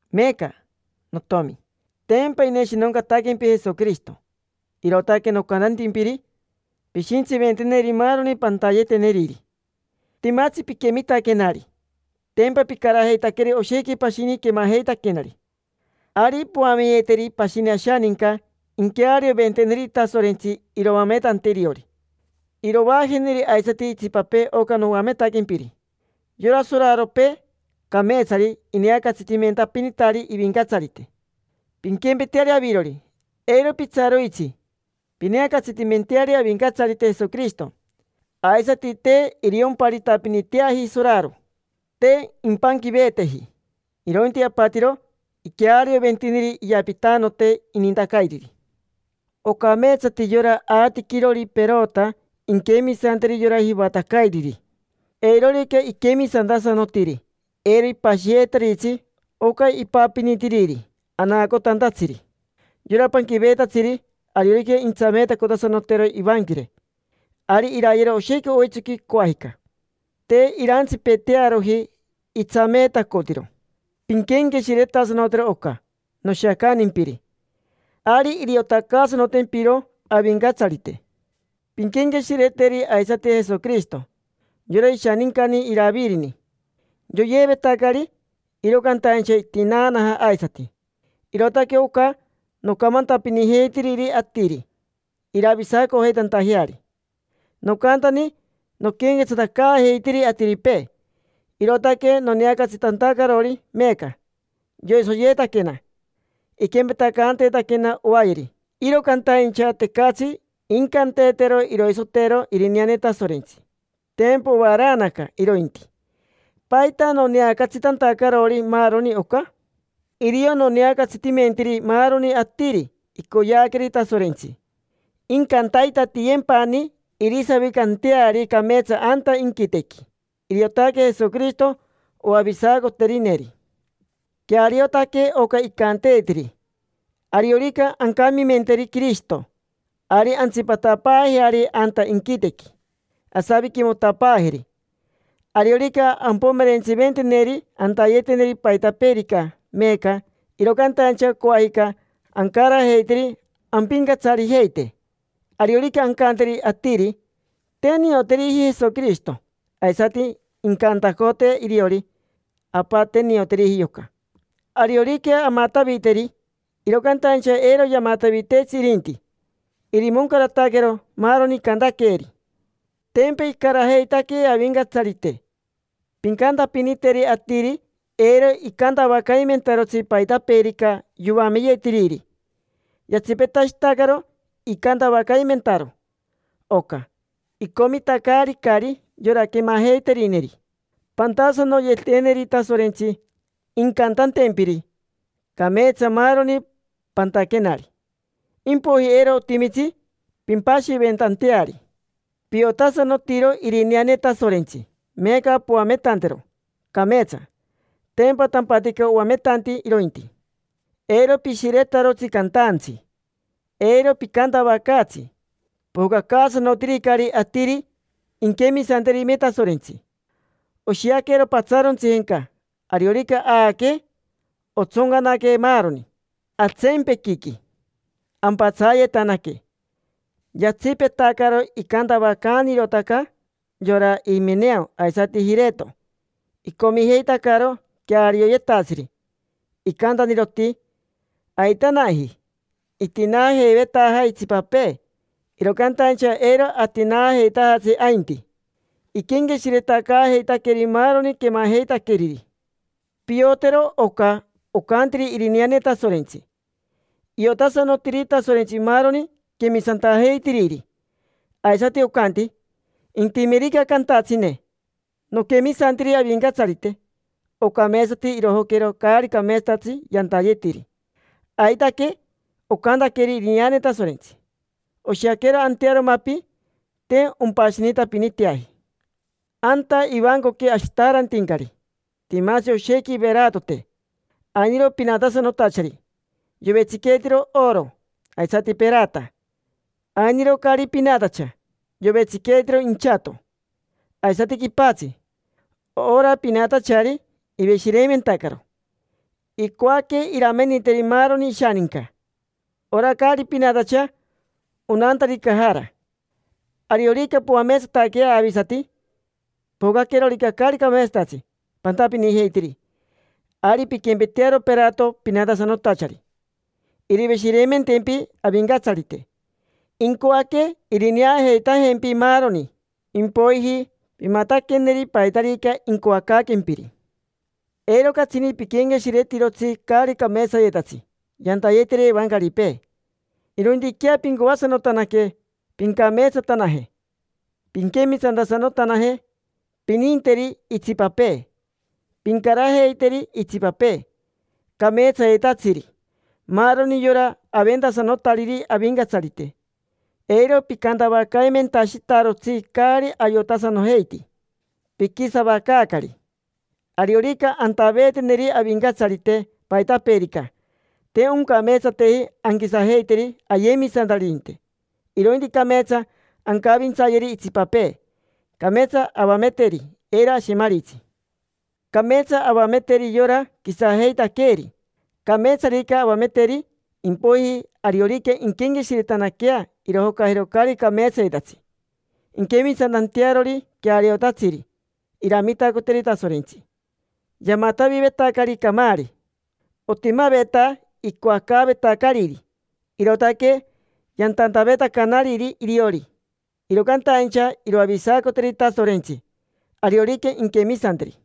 Meeca, notiomi, tempa ineshinoncataquempi Jesoquirishito, irootaque nocantantimpiri pishintsiventeneri maaroni pantayeteneriri. Timatsi piquemitaquenari, tempa picarajeitaqueri oshequi pashini quemajeitaquenari. Ari poameyeteri pashini ashaninca, inquearioventeneri Tasorentsi iroametante iriori. Irovaajeneri aisati itsipapee oca noametaquempiri. Yora soraropee cameetsari ineacatsitimentapinitari ivincatsarite. Pinquempeteari avirori, eiro pitsaroitsi pineacatsitimenteari Avincatsarite Jesoquirishito. Aisati te iriomparitapiniteaji soraro, te impanquiveeteji, irointi apatiro iquearioventiniri iyapitanote inintacairiri. Ocameetsati yora aatiquirori perota inquemisanteri yora jivatacairiri. Eirorica iquemisantasanotiri, eiro ipashiyeetaritsi oca ipapinitiriri anaacotantatsiri. Yora panquiveetatsiri, ariorica intsameetacotasanotero ivanquire, ari irayero oshequi oitsoqui, coajica. Te irantsipetearoji itsameetacotiro. Pinquenqueshiretasanotero oca noshiacantimpiri, ari iriotacaasanotempiro Avincatsarite. Pinquenqueshireteri aisati Jesoquirishito, yora ishanincani Iravirini; yoyeevetacari, iro cantaincha itinaanaja aisati. Irootaque oca nocamantapinijeitiriri atiri, iravisacojeitantajeari. Nocantani noquenquetsatacaajeitiri atiripee, irootaque noneacatsitantacarori meeca. Yoisoyeetaquena, iquempetacanteetaquena oayeri. Iro cantaincha tecatsi incanteetero iroisotero irineane Tasorentsi: tempa ovaraanaca irointi. ¿Paita noneacatsitantacarori maaroni oca? Irio noneacatsitimentiri maaroni atiri icoyeaqueri Tasorentsi, incantaitatiyempani irisavicanteari cameetsa anta inquitequi. Iriotaque Jesoquirishito oavisacoterineri. Queariotaque oca icanteetiri: “Ariorica ancamimenteri Quirishito, ari antsipatapaajeari anta inquitequi, asaviquimotapaajeri. Ariorica ampomerentsiventeneri antayeteneri paitapeerica meeca, iro cantaincha coajica ancarajeiteri ampincatsarijeite. Ariorica ancanteri atiri: ‘Te nioteriji Jesoquirishito’, aisati incantacotee iriori: ‘Apa, te nioteriji yoca’. Ariorica amataviteri, iro cantaincha eiro yamataviteetsi irinti. Irimoncarataquero maaroni icantaqueeri”. Tempa icarajeitaquee Avincatsarite. Pincantapiniteri atiri eiro icantavacaimentarotsi paitapeerica yoameyetiriri. Yatsipetashitacaro icantavacaimentaro oca, icomitacaaricari yora quemajeiterineri. Pantasanoyeteneri Tasorentsi, incantantempiri: “Cameetsa maaroni pantaquenari”, impoiji eiro otimitsi pimpashiventanteari. Piotasanotiro irineane Tasorentsi, meeca poametantero cameetsa; tempa tampatica oametanti irointi. Eiro pishiretarotsi cantaantsi, eiro picantavacaatsi: pojocacaasanotiricari atiri inquemisanterime Tasorentsi. Oshiaquero patsaarontsijenca, ariorica aaquee, ontsoncanaquee maaroni atseempequiqui, ampatsayetanaque. Yatsipetacaro icantavacaanirotaca yora Imeneo aisati Jireto. Icomijeitacaro quearioyetatsiri. Icantaniroti: “Aitanaji. Itinaajeivetaja itsipapee, iro cantaincha eiro atinaajeitajatsi ainti”. Iquenqueshiretacaajeitaqueri maaroni quemajeitaqueriri. Piotero ocaocantiri irineane Tasorentsi: “Iotasanotiri Tasorentsi maaroni quemisantajeitiriri”. Aisati ocanti: “Intimerica cantatsine: ‘Noquemisantiri Avincatsarite’, ocameetsati irojoquero caari cameetsatatsi yantayetiri”. Aitaque ocantaqueri. Irineane Tasorentsi oshiaquero antearo mapi: te ompashinitapiniteaji. Anta ivancoqui ashitaarantincari timatsi oshequi iveratote. Ainiro pinatasanotachari, yovetsiqueetiro oro aisati perata. Ainiro caari pinatacha, yovetsiqueetiro inchato aisati quipatsi. Ora pinatachari, iveshireimentacaro: icoaque irameniteri maaroni ishaninca. Ora caari pinatacha onantari cajara. Ariorica poameetsataquea avisati, pojocaquerorica caari cameetsatatsi pantapinijeitiri, ari pinquempetearo perato pinatasanotachari; iriveshireimentempi Avincatsarite, incoaque irineajeitajempi maaroni. Impoiji pimataqueneri paitarica incoacaaquempiri. Eiro catsini piquenqueshiretirotsi caari cameetsayetatsi yantayetiri evancaripee. Irointiquea pincoasanotanaque pincameetsatanaje, pinquemisantasanotanaje, pininteri itsipapee, pincarajeiteri itsipapee cameetsayetatsiri: maaroni yora aventasanotariri Avincatsarite. Eiro picantavacaimentashitarotsi caari ayotasanojeiti: piquisavacaacari. Ariorica antaveeteneri Avincatsarite paitapeerica, te oncameetsateji anquisajeiteri ayemisantaririnte; irointi cameetsa ancavintsayeri itsipapee, cameetsa avameteri, eiro ashemaritsi, cameetsa avameteri yora quisajeitaqueeri. Cameetsarica avameteri, impoiji ariorica inquenqueshiretanaquea, irojocajero caari cameetsayetatsi inquemisantantearori queariotatsiri. Iramitacoteri Tasorentsi. Yamatavivetacari camaari: Otimaveta icoacaavetacariri, irootaque yantantavetacanariri iriori; iro cantaincha iroavisacoteri Tasorentsi, ariorica inquemisanteri.